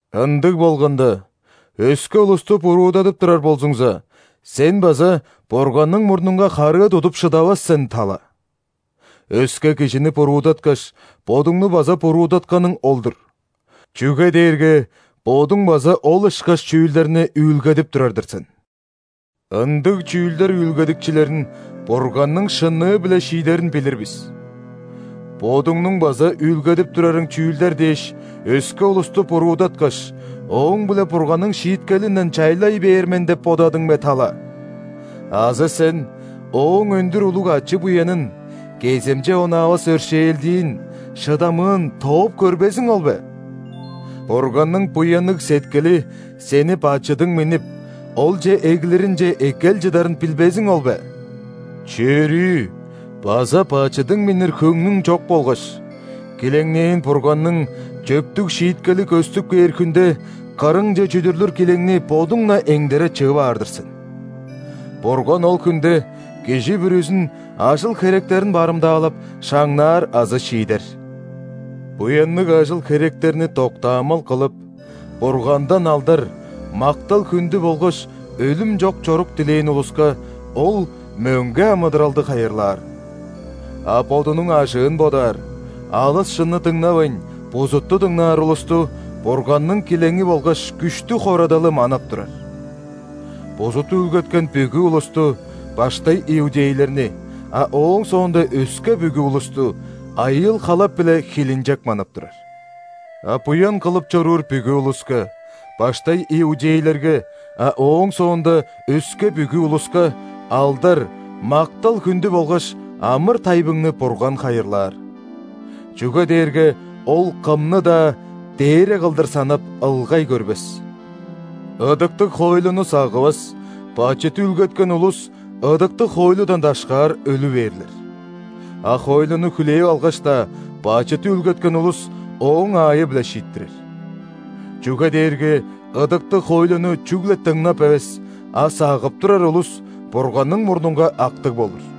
Ындыг болганда, өске улусту буруудадып турар болзуңза, сен база Бурганның мурнунга харыы тудуп шыдавас сен, тала. Өске кижини буруудаткаш, бодуңну база буруудатканың ол-дур, чүге дээрге бодуң база ол ышкаш чүүлдерни үүлгедип турар-дыр сен. Ындыг чүүлдер үүлгедикчилерин Бурганның шынныы-биле шиидерин билир бис. Бодуңнуң база үүлгедип турарың чүүлдер дээш өске улусту буруудаткаш, ооң-биле Бурганның шииткелинден чайлай бээр мен деп бодадың бе, тала? Азы сен Ооң өндүр улуг ачы-буянын, кеземче онаавас өршээлдиин, шыдамыын тооп көрбезиң ол бе? Бурганның буянныг сеткили сени бачыдың миннип, Олче эглиринче эккел чыдарын билбезиң ол бе? Чөрүү база бачыдың миннир хөңнүң чок болгаш, килеңнээн Бурганның чөптүг шииткели көстүп кээр хүнде кырыңче чүдүрлүр килеңни бодуң-на эңдере чыып аар-дыр сен. Бурган ол хүнде кижи бүрүзүн ажыл-херектерин барымдаалап, шаңнаар азы шиидер. Буянныг ажыл-херектерни доктаамал кылып, Бургандан алдар, мактал-хүндү болгаш өлүм чок чорук дилээн улуска Ол мөңге амыдыралды хайырлаар. А бодунуң ажыын бодаар, алыс шынны дыңнавайн, бузутту дыңнаар улусту Бурганның килеңи болгаш күштүг хорадалы манап турар. Бузут үүлгеткен бүгү улусту – баштай иудейлерни, а ооң соонда өске бүгү улусту – айыыл-халап биле хилинчек манап турар. А буян кылып чоруур бүгү улуска – баштай иудейлерге, а ооң соонда өске бүгү улуска – алдар, мактал-хүндү болгаш амыр-тайбыңны Бурган хайырлаар. Чүге дээрге Ол кымны-даа дээре кылдыр санап, ылгай көрбес. Ыдыктыг хоойлуну сагывас, бачыт үүлгеткен улус ыдыктыг хоойлудан дашкаар өлү бээрлер. А хоойлуну хүлээп алгаш-даа, бачыт үүлгеткен улус ооң аайы-биле шииттирер. Чүге дээрге ыдыктыг хоойлуну чүгле дыңнап эвес, а сагып турар улус Бурганның мурнунга актыг болур.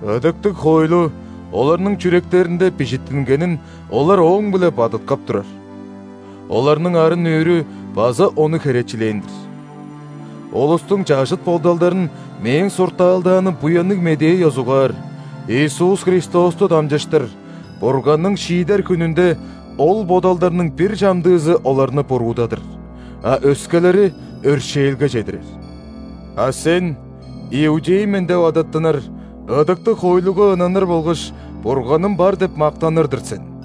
Ыдыктыг хоойлу оларның чүректеринде бижиттингенин олар ооң-биле бадыткап турар. Оларның арын-нүүрү база ону херечилээн-дир. Улустуң чажыт бодалдарын мээң суртаалдааным Буянныг Медээ ёзугаар, Иисус Христосту дамчыштыр Бурганның шиидер хүнүнде ол бодалдарның бир чамдыызы оларны буруудадыр, а өскелери – өршээлге чедирер. А сен иудей мен деп адаттынар, ыдыктыг хоойлуга ынаныр болгаш Бурганым бар деп мактаныр-дыр сен.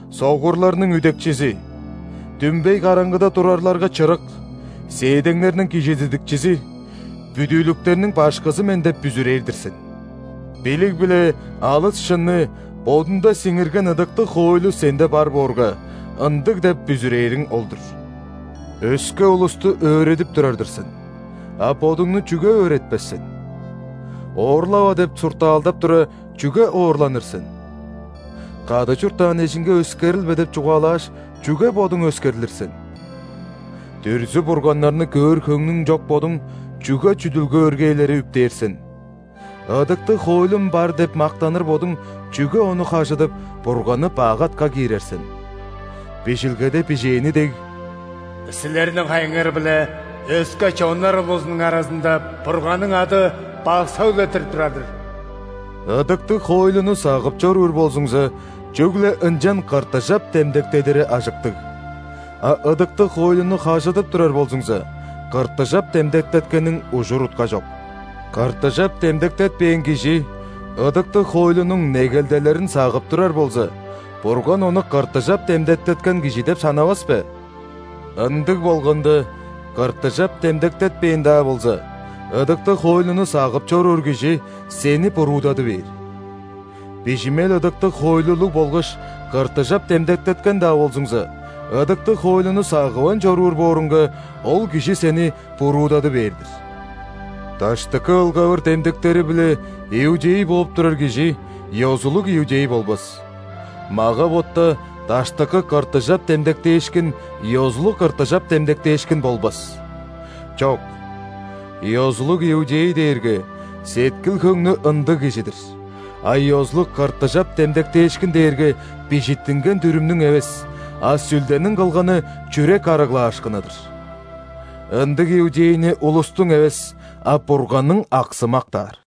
Согурларның үдекчизи, дүмбей караңгыда турарларга чырык, сээдеңнерниң кижизидикчизи, бүдүүлүктерниң башкызы мен деп бүзүрээр-дир сен. Билиг биле алыс шынны бодунда сиңирген ыдыктыг хоойлу сенде бар боорга, ындыг деп бүзүрээриң ол-дур. Өске улусту өөредип турар-дыр сен, а бодуңну чүге өөретпес сен? «Оорлава» деп суртаалдап тура, чүге оорланыр сен? «Кады чурттаан эжиңге өскерилбе» деп чугаалааш, чүге бодуң өскерлир сен? Дүрзү-бурганнарны көөр хөңнүң чок бодуң, чүге чүдүлге өргээлери үптээр сен? Ыдыктыг хоойлум бар деп мактаныр бодуң, чүге ону хажыдып, Бурганны бак атка киирер сен? Бижилгеде бижээни дег, «Силерниң хайыңар-биле өске чоннар улузунуң аразында Бурганның ады бак сөглеттирип турар-дыр». Ыдыктыг хоойлуну сагып чоруур болзуңза, чүгле ынчан ·кыртыжап демдектедири ажыктыг. А ыдыктыг хоойлуну хажыдып турар болзуңза, кыртыжап демдектеткениң ужур-утка чок. Кыртыжап демдектетпээн кижи ыдыктыг хоойлунуң негелделерин сагып турар болза, Бурган ону кыртыжап демдектеткен кижи деп санавас бе? Ындыг болганда, кыртыжап демдектетпээн-даа болза, ыдыктыг хоойлуну сагып чоруур кижи сени буруудады бээр. Бижимел ыдыктыг хоойлулуг болгаш кыртыжап демдектеткен-даа болзуңза, ыдыктыг хоойлуну сагывайн чоруур бооруңга, ол кижи сени буруудады бээр-дир. Даштыкы ылгавыр демдектери-биле иудей бооп турар кижи ёзулуг иудей болбас, мага-ботта даштыкы кыртыжап демдектээшкин ёзулуг кыртыжап демдектээшкин болбас. Чок! Ёзулуг иудей дээрге сеткил-хөңнү ындыг кижи-дир, а ёзулуг кыртыжап демдектээшкин дээрге бижиттинген дүрүмнүң эвес, а Сүлдениң кылганы чүрек арыглаашкыны-дыр. Ындыг иудейни улустуң эвес, а Бурганның аксы мактаар.